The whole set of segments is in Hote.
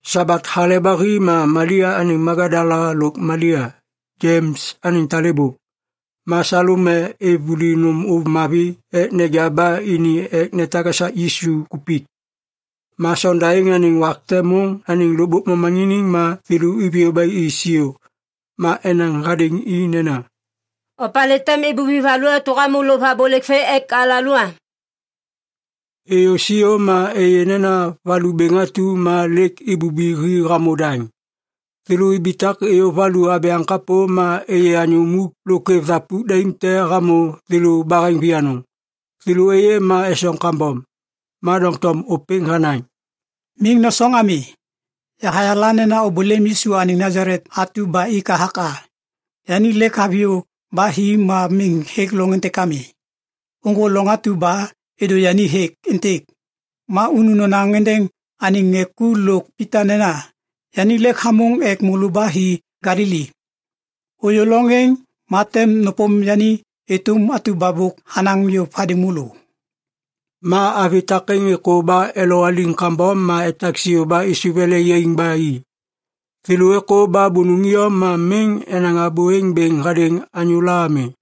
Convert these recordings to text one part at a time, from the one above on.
Sabat hale ba hi ma Malia anêŋ Magadala lôk Malia, Jems anêŋ talêbô, ma Salome êv vuli nôm ôv mavi ek neja ba ini ek netak esak Yisu kupik. Ma sonda êŋ anêŋ wak te môŋ anêŋ lôkbôk momaŋiniŋ ma thêlô iviyô ba i siô. Ma enaŋ hadêŋ i nena, “Opalê tem ibubi valu atu ba hamô lôv abôlêk vê ek alalô am?” Êyô siô ma êyê nena valu bêŋ atu ma lêk ibubi hi hamô daŋ. Thêlô ibitak êyô valu abyaŋ kapô ma êyê anyô muk lôk kwêv thapuk daim te hamô thêlô baheŋ vianôŋ. Thêlô êyê ma esoŋ kambom. Ma doŋtom ôpêŋ hanaŋ, “Miŋ nosoŋ ami. Yahayala nena ôbôlêm Yisu anêŋ Nasalet atu ba ik hathak a. Yani lêk haviyô ba hi ma miŋ hêk loŋ êntêk ami. Ôŋgô loŋ atu ba êdô yani hêk êntêk. Ma unu nonaŋ êndêŋ anêŋ ŋê ku lôk Pita nena, ‘Yani lêk hamôŋ ek môlô ba hi Galili. Ôyô loŋ êŋ ma tem nôpôm yani êtôm atu ba bôk hanaŋ yôv hadêŋ môlô.’” Ma avi takêŋ êkô ba elowaliŋ kambom ma etak siô ba êsôv ele yaiŋ ba i. Thêlô êkô ba bônôŋ iyom ma miŋ enaŋ abô êŋ hadêŋ anyôla ami.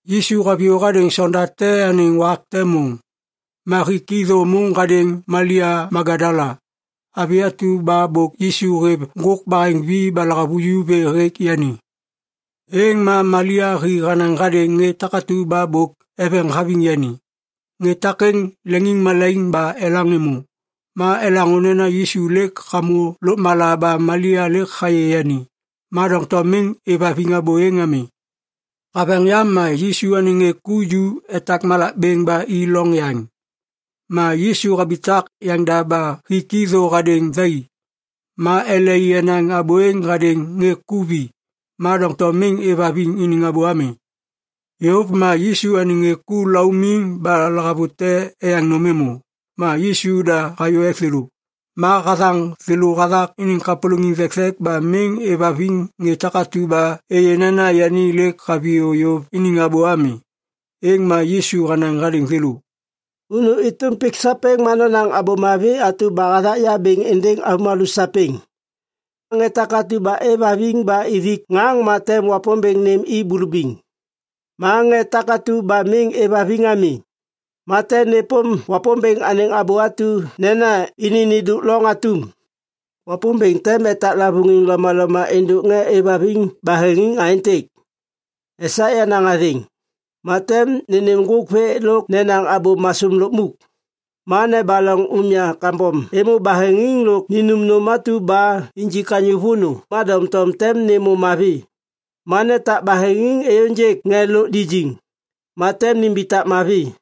Yisu haviyô hadêŋ sonda te anêŋ wak te môŋ. Ma hik i thô môŋ hadêŋ Malia Magadala, avi atu ba bôk Yisu hêv ŋgôk baheŋvi ba lahavuju vê hêk yani. Êŋ ma Malia hi hanaŋ hadêŋ ŋê takatu ba bôk eveŋ haviŋ yani. Ŋê takêŋ leŋiŋmalaiŋ ba elaŋ êmô. Ma elaŋô nena Yisu lêk hamô lôkmala ba Malia lêk hayê yani, ma doŋtom miŋ êvhaviŋ abô êŋ ami. Haveŋ yam ma Yisu anêŋ ŋê ku ju etak malak bêŋ ba i loŋ yaŋ. Ma Yisu habitak yaŋda ba hik i thô hadêŋ thai. Ma ele i enaŋ abô êŋ hadêŋ ŋê ku vi, ma doŋtom miŋ êvhaviŋ iniŋ abô ami. Yôv ma Yisu anêŋ ŋê ku laumiŋ ba lahavute eyaŋ nôm êmô, ma Yisu da hayô ek thêlô. Ma hathaŋ thêlô hathak iniŋ kapôlôŋiŋ thekthek ba miŋ êvhaviŋ ŋê takatu ba êyê nena yani lêk haviyô yôv iniŋ abô ami. Êŋ ma Yisu hanaŋ hadêŋ thêlô, “Unu êtôm pik sapêŋ ma nonaŋ Abô Mavi atu ba hathak ya bêŋ êndêŋ avômalô sapêŋ. Ŋê takatu ba êvhaviŋ ba ithik ŋaŋ ma tem Wapômbêŋ nêm i bulubiŋ. Ma ŋê takatu ba miŋ êvhaviŋ ami, ma tem nêpôm Wapômbêŋ anêŋ abô atu nena ini nêndôk loŋ atum. Wapômbêŋ tem etak lavôŋiŋ lomaloma êndôk ŋê êvhaviŋ baheŋiŋ aêntêk. Esak yenaŋ athêŋ, ma tem nênêm ŋgôk vê lôk nenaŋ abô masôm lukmuk. Ma nebaloŋ umya kambom êmô baheŋiŋ lôk ninum nôm atu ba injik anyô vônô ma doŋtom tem nêmô mavi. Ma netak baheŋiŋ êyôŋgêk ŋê lôk lijiŋ, ma tem nimbitak mavi.”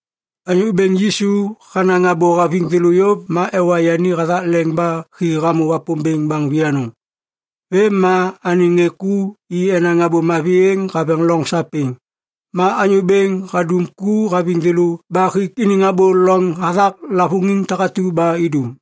Anyô Bêŋ Yisu hanaŋ abô haviŋ thêlô yôv ma ewa yani hathak leŋ ba hi hamô Wapômbêŋ baŋ vianôŋ. Vêm ma anêŋ ŋê ku i enaŋ Abô Mavi êŋ haveŋ loŋ sapêŋ. Ma Anyô Bêŋ hadum ku haviŋ thêlô ba hik iniŋ abô loŋ hathak lavôŋiŋ takatu ba idum.]